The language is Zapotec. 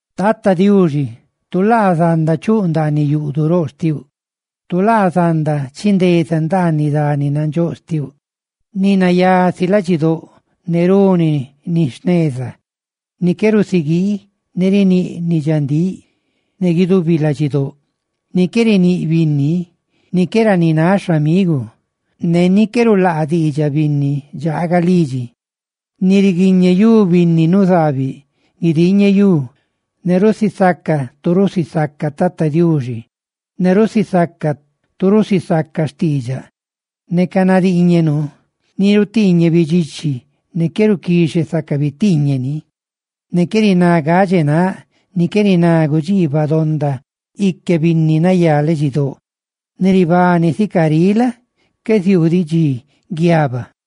Tata Diuxi, tu laa zanda chuꞌ ndaaniꞌ yuꞌduꞌ roꞌ xtiuꞌ, tu laa zanda chindeza ndaaniꞌ dani nandxóꞌ xtiuꞌ. Ni nayá si ladxidóꞌ ne runi ni jneza; ni qué rusiguii ne riníꞌ ni dxandíꞌ ne guidubi ladxidóꞌ; ni qué riníꞌ binni; ni qué ranináꞌ xhamigu ne ni qué rulaa diidxaꞌ binni ni dxaaga lidxi; ni riguiñeyú binni nuzaabiꞌ guidiñeyú, ne rusisaca tu rusisaca Tata Diuxi; ne rusisaca tu rusisaca xtiidxaꞌ neca nadiiñe nuu; ni rutiiñe bidxichi ne qué ruquixe saca bitiiñeꞌ ni; ni qué riná gadxe náꞌ, ni qué riná gudxiibaꞌ donda ique binni nayá ladxidóꞌ. Ni ribani sica riꞌ la? qué ziuu diꞌ dxi guiaba.